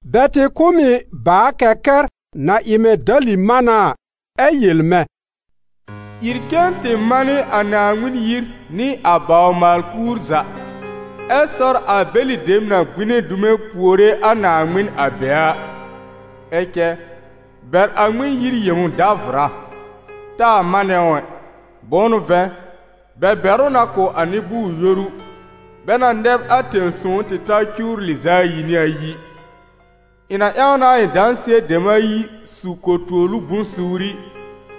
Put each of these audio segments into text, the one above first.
Bɛ tɩ kʋ̀ m ɩ bàa-kɛkɛr na ɩ mɛ̃ dali-mána a, ɛ yel mɛ̃: «Ìr cen tɩ manɩ a Naaŋmɩn yir nɩ a bawr-maal-kuur za, ɛ sɔr a bɛlɩ dem na gbine dume puore a Naaŋmɩn a be a. Ɛ cɛ, bɛr a Ŋmɩn-yir yẽw davʋra; taa manɛ ʋ ɛ, bʋ̃ʋ n'ʋ vɛ̃, bɛ bɛr ʋ na kʋ̀ a nɩ-bʋʋr-yoru, bɛ na nɛb a tẽ-sõw tɩ ta cuwr lɩz'a ayi nɩ ayi. Ɩ̃ na ƴãw na a ɩ̃ dãsɩɛ dem ayi su ko-tuolu bʋ̃-suuri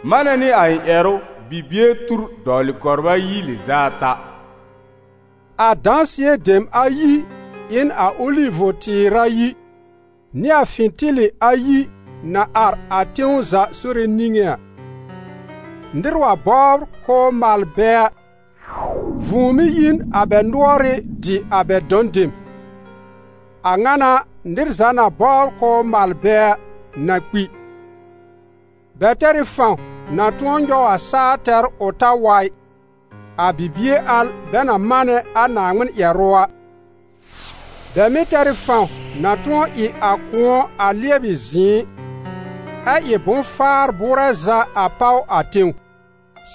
manɛ nɩ a ɩ̃ ƴɛrʋ, bibie tur dɔwlɩ kɔbr ayi lɩz'a ata.» A dãsɩɛ dem ayi ɩ n a Olivʋ-tɩɩr ayi, nɩ a fɩ̃tɩlɩ ayi na ar a tẽw za Sore niŋé a. Nɩr wa bɔbr k'ʋʋ mal bɛ a, vũu mɩ́ yi n a bɛ nʋɔrɩ́ dɩ a bɛ dɔ̃ dem; a ŋa n'a, nɩr za na bɔbr k'ʋʋ mal bɛ a, na kpi. Bɛ tɛr ɩ fãw na tʋ̃ɔ nyɔw a saa tɛr ʋ ta wa ɩ, a bibie al bɛ na manɛ a Naaŋmɩn ƴɛrʋ a. Bɛ mɩ̀ tɛr ɩ fãw na tʋ̃ɔ ɩ a kʋ̃ɔ a lɩɛbɩ zɩ̃ɩ, ɛ ɩ bʋ̃-faar bʋʋrɛ za a páw a tẽw,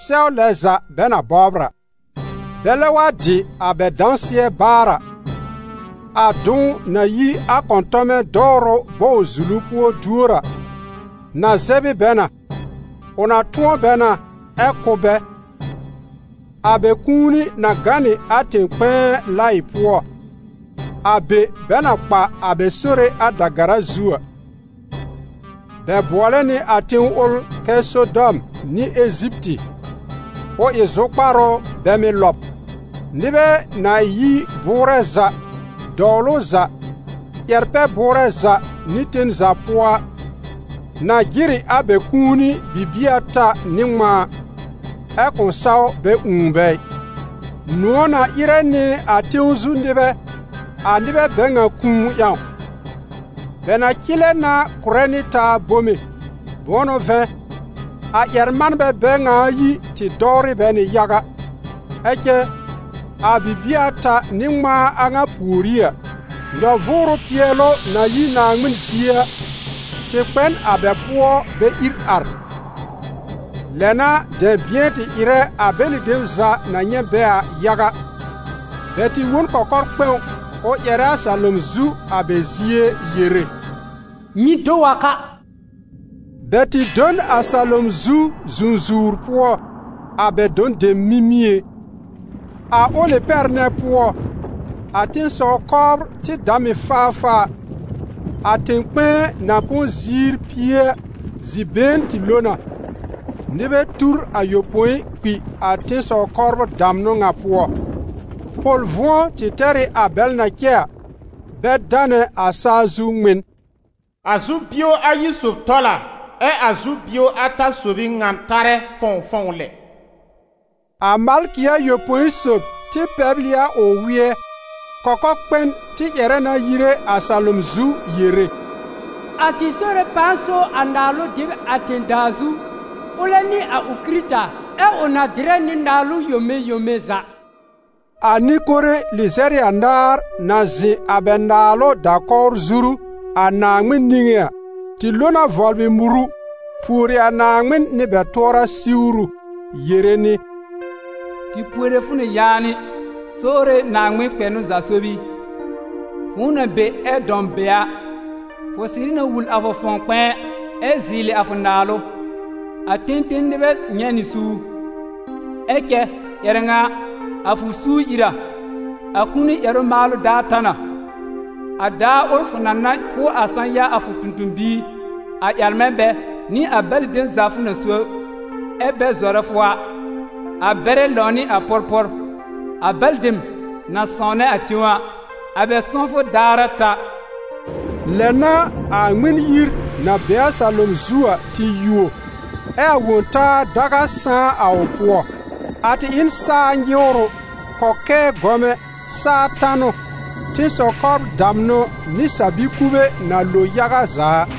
sɛw lɛ za bɛ na bɔbr a. Bɛlɛ wa dɩ a bɛ dãsɩɛ baar a, a dʋ̃w na yi a kɔ̃tɔmɛ dɔwrʋ bɔw-zulu pʋɔ duor a, na zɛb ɩ bɛ na, ʋ na tʋ̃ɔ bɛ na ɛ́ kʋ́ bɛ. A bɛ kũuni na gã nɩ a tẽ-kpɛ̃ɛ laɩ pʋɔ, a be bɛ na kpa a bɛ Sore a da-gara zu a. Bɛ bʋɔlɛ nɩ a tẽw ʋl kɛ Sodɔm nɩ Eziptɩ, ʋ ɩ zʋkpar ʋ bɛ mɩ́ lɔb. Nɩbɛ na yi bʋʋrɛ za, dɔwlʋ za, ƴɛr-pɛ-bʋʋrɛ za nɩ tẽw za pʋɔ a, na jɩr ɩ a bɛ kũuni bibie ata nɩ ŋmãa, ɛ kʋ̃ saw bɛ ũù bɛ ɩ. Nʋ̃ɔ̀ na ɩrɛ nɩ a tẽw zu nɩbɛ, a nɩbɛ bɛ ŋa kũu ƴãw; bɛ na cɩlɛ na kʋ̀rɛ nɩ taa bome, bʋ̃ʋ n'ʋ vɛ̃, a ƴɛr-manbɛ bɛ ŋa ayi tɩ dɔwrɩ bɛ nɩ yaga. Ɛ cɛ, a bibie ata nɩ ŋmãa a ŋa pùorí a, nyɔ-vʋʋrʋ pɩɛlʋ na yi Naaŋmɩn zie a, tɩ kpɛ n a bɛ pʋɔ bɛ ìr ar. Lɛ n'a dɛ̃bɩ̃ɛ tɩ ɩrɛ a bɛlɩ dem za na nyɛ̃ bɛ a yaga. Bɛ tɩ wõ n kɔkɔr-kpɛ̃w ʋ ƴɛrɛ a salom zu a bɛ zie yere: «Nyɩ do wa ka!» Bɛ tɩ do n a salom zu zũzuwr pʋɔ, a bɛ dɔ̃ dem mimĩé. A ʋlɩ pɛr nɛ pʋɔ, a tẽ-sɔw-kɔbr tɩ dam ɩ faafaa; a tẽ-kpɛ̃ɛ na põ ziir pie a, zi-been tɩ lo na, nɩbɛ tur ayopõi kpi a tẽ-sɔw-kɔbr damnʋ ŋa pʋɔ. Pʋl-vʋ̃ɔ tɩ tɛr ɩ a bɛl na cɛ a, bɛ danɛ a saa zu Ŋmɩn. A zu-bio ayi sob tɔl a, ɛ a zu-bio ata sob ɩ ŋan tarɛ fɔ̃wfɔ̃w lɛ. A malkɩ ayopõi sob tɩ pɛbl ɩ a ʋ wɩ́ɛ; kɔkɔ-kpɛn tɩ ƴɛrɛ na yire a salom zu yere: «A tɩ Sore pãa so a naalʋ dɩb a tẽ-daa zu, ʋlɛ nɩ a ʋ Kɩrɩta, ɛ ʋ na dɩrɛ nɩ naalʋ yome yome za!» A nɩ-kore lɩzɛr ɩ anaar na zɩ̃ a bɛ naalʋ da-kɔwr zuru, a Naaŋmɩn niŋé a, tɩ lo na vɔblɩ muru pùori a Naaŋmɩn nɩ bɛ tʋɔra siwru, yere nɩ: «Tɩ puore fʋ nɩ yaanɩ, Sore Naaŋmɩn kpɛnʋ za sob i, fʋ̃ʋ na be ɛ dãw be a, fʋ sɩrɩ na wul a fʋ fãw kpɛ̃ɛ ɛ zɩɩlɩ a fʋ naalʋ. A ten ten nɩbɛ nyɛ̃ nɩ suur, ɛ cɛ, ƴɛrɛ ŋa a, a fʋ suur ìr a. A kũuni ƴɛrʋ maalʋ daar ta na. A daar ʋl fʋ na na kʋ̀ a sã-ya a fʋ tõ-tõ-biir, a ƴɛr-manbɛ, nɩ a bɛlɩ dem za fʋ na so, ɛ́ bɛ zɔrɛ fʋ a, a bɛrɛ lãwnɩ a pʋrpʋr; a bɛlɩ dem na sãwnɛ a tẽw a, a bɛ sãwfʋ daar a ta!» Lɛ n'a a Ŋmɩn-yir na be a salom zu a tɩ yuo, ɛ́ a Wõ-taa daga sãá a ʋ pʋɔ. A tɩ ɩ n saa nyɩwrʋ, kɔkɛɛ gɔmɛ, saa tanʋ, tẽ-sɔw-kɔbr damnʋ nɩ sa-bi-kube na lo yaga za a.